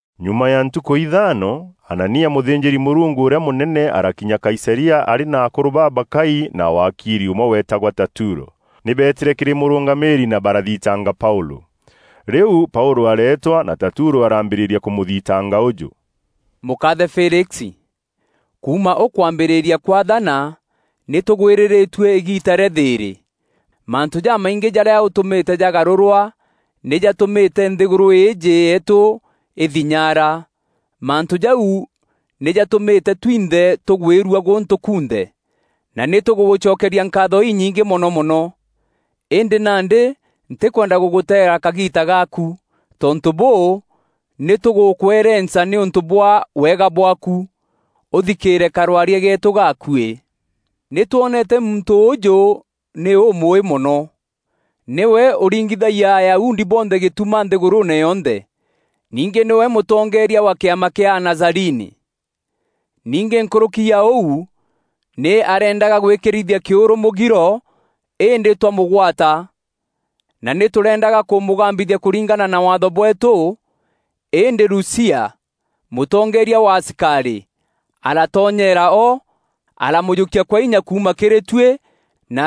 Nyuma ya ntukû ithaano, Anania, mûthînjîri-Mûrungu ûrîa mûnene arakinya Kaisaria arî na akûrû babakai na waakiri ûmwe weetagwa Tatulo. Nî beetîre kîrî mûrûngamîîri na barathintanga Paûlû. Rîu Paûlû areetwa, na Tatulo arambîrîria kûmûthitanga ûjû: “Mûkaathe Felix, kuuma ûkwambîrîria kwaathana nî tûgwîrîrîtue îgiita rîa thîîrî. Mantû jamaingî jarîa ûtûmîte jagarûrwa nî jatûmîte nthîgûrû îîjî yeetû îthinyaara. Mantû jau nî jatûmîte twinthe tûgwîrua gûntû kunthe, na nî tûgûgûcokeria nkaatho inyingî mono mono. Îndî nandî, ntîkwenda gûgûteera kagiita gaaku; tontû bûû, nî tûgûkwerenca nîûntû bwa wega bwaaku, ûthikîîre karwaria geetû gaakuî. Nî twonete muntû ûûjû nî ûmûûî mono. Nîwe ûringithagia Ayahudi bonthe gîtuma nthîgûrûûne yonthe. Ningî nîwe mûtongeeria wa kîama kîa Anazarini. Ningî nkûrûki ya ûu, nî areendaga gwîkîrithia kîûrû mûgiro îndî twamûgwata [na nî tûreendaga kûmûgambithia kûringana na Waatho bweetû. Îndî Lusia, mûtongeeria wa asikarî, aratonyeera o, aramûjûkia kwa inya kuuma kîrî tuî na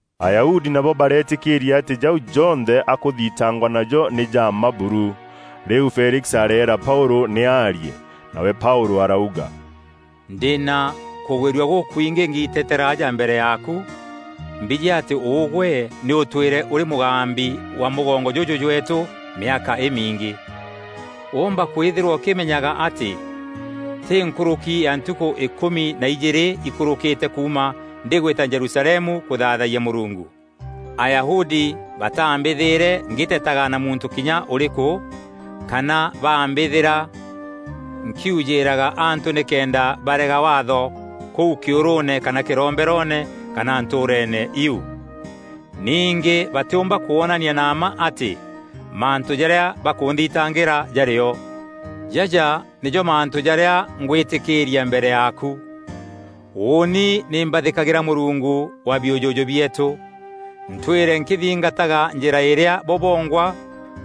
Ayahudi nabo bareetîkîîria atî jau jonthe akûthitangwa najo nî ja mma buru. Rîu Felix areera Paûlû nî aarie. Nawe Paûlû arauga, “Ndî na kûgwîrua gûkwingî ngiiteteera aja mbere yaaku mbijî atî ûgwe nî ûtwîre ûrî mûgambi wa mûgongo jûjû jweetû mîaka îmingî. Woomba kwîthîrwa ûkîmenyaga atî tî nkûrûki ya ntukû îkûmi na ijîîrî ikûrûkîte kuuma ndîgwîta Jerusalemu kûthaathayia Mûrungu. Ayahudi baatambîthîre ngîtetaga na muntû kinya ûrîkû, kana baambîthîra nkîûjîîraga antû nîkenda barega Waatho kûu kîûrûûne kana kîromberoone, kana ntûûreene iu. Ningî batîûmba kwonania na mma atî mantû jarîa bakûnthitangîra jarî o. Jaja nîjo mantû jarîa ngwîtîkîîria mbere yaaku: Ûûni nî mbathîkagîra Mûrungu wa biûjûjû bieetû, ntwîre nkîthingataga Njîra îrîa bo bongwa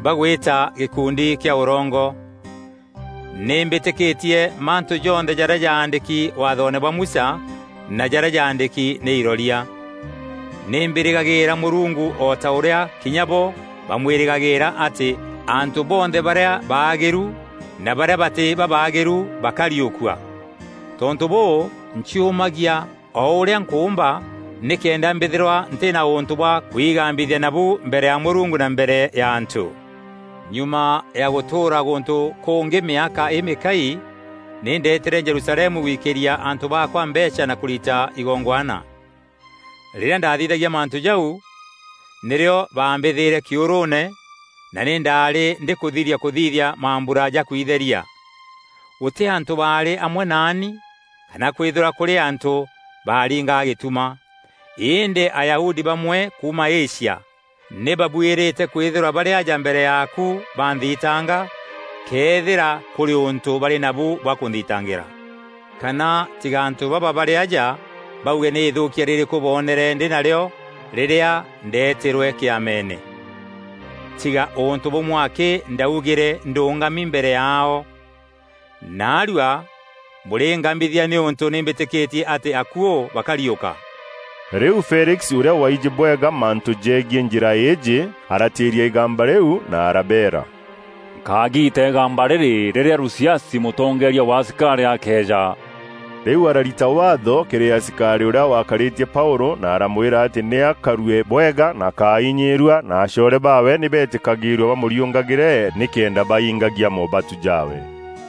bagwîta gîkundi kîa ûrongo. Nî mbîtîkîtie mantû jonthe jarîa jaandîki Waathoone bwa Musa na jarîa jaandîki nî iroria. Nî mbîrîgagîîra Mûrungu o ta ûrîa kinya bo bamwîrîgagîîra atî, antû bonthe barîa baagîru na barîa batî babaagîru bakariûkua. Tontû bûû, nciûmagia o ûrîa nkûûmba nîkenda mbîthîrwa ntî na ûntû bwa kwigambithia nabu mbere ya Mûrungu na mbere ya antû. “Nyuma ya gûtûûra gûntû kûngî mîaka îmîkaai, nî ndeetîre Jerusalemu gwikîria antû baakwa mbeecha na kûrita igongwana. Rîrîa ndaathithagia mantû jau, nîrîo baambîthîre kîûrûûne, na nî ndaarî ndîkûthiria kûthithia mambura ja kwitheria. Gûtî antû baarî amwe naani kana kwîthîrwa kûrî antû baaringaga gîtuma. Îndî Ayahudi bamwe kuuma Asia nî babuîrîte kwîthîrwa barî aja mbere yaaku banthitanga, këethîra kûrî ûntû barî nabu bwa kûnthitangîra. Kana tiga antû baba barî aja bauge nî îthûûkia rîrîkû boonere ndî narîo rîrîa ndeetîrwe Kîameene, tiga ûntû bûmwe akî ndaugîre ndûngami mbere yaao: ‘Naarua bûrîngambithia nîûntû nî mbîtîkîtie atî akuû bakariûka.’” Rîu Felix, ûrîa waijî bwega mantû jegiî Njîra îîjî, aratîîria îgamba rîu na arabeera, “Nkagiita îgamba rîrî rîrîa Lusiasi, mûtongeeria wa asikarî akeeja.” Rîu ararita waatho kîrî asikarî ûrîa waakarîtie Paûlû na aramwîra atî nî akarue bwega na akáinyîîrua na acoore baawe nî betîkagîîrue bamûriûngagîre nîkenda baingagia moobatu jaawe.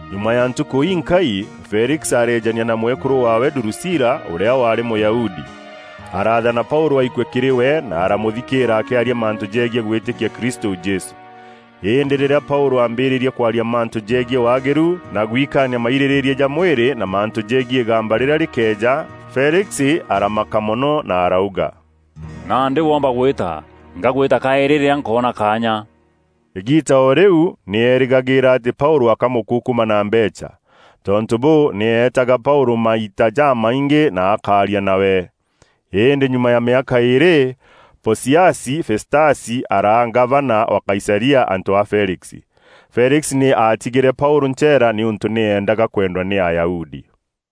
Nyuma ya ntukû inkai, Felix areejania na mwekûrû waawe Durusila, ûrîa waarî Mûyahudi. Araathana Paûlû aikue kîrî we, na aramûthikîîra akîaria mantû jegiî gwîtîkia Kristû Jesû. Îndî rîrîa Paûlû aambîrîîrie kwaria mantû jegiî waagîru, na gwikaania mairîrîîria ja mwîrî na mantû jegiî îgamba rîrîa rîkeeja, Felix aramaka mono na arauga, “Nandî woomba gwîta; ngagwîta kaîrî rîrîa nkoona kaanya.” Îgiita o rîu nî eerîgagîîra atî Paûlû akamûkukuma na mbeecha. Tontû bûû, nî eetaga Paûlû maita jamaingî na akaaria nawe. Îndî nyuma ya mîaka îîrî, Pociasi Festasi araa ngavana wa Kaisaria antû a Felix. Felix nî aatigîre Paûlû ncheera nîûntû nî eendaga kwendwa nî Ayahudi.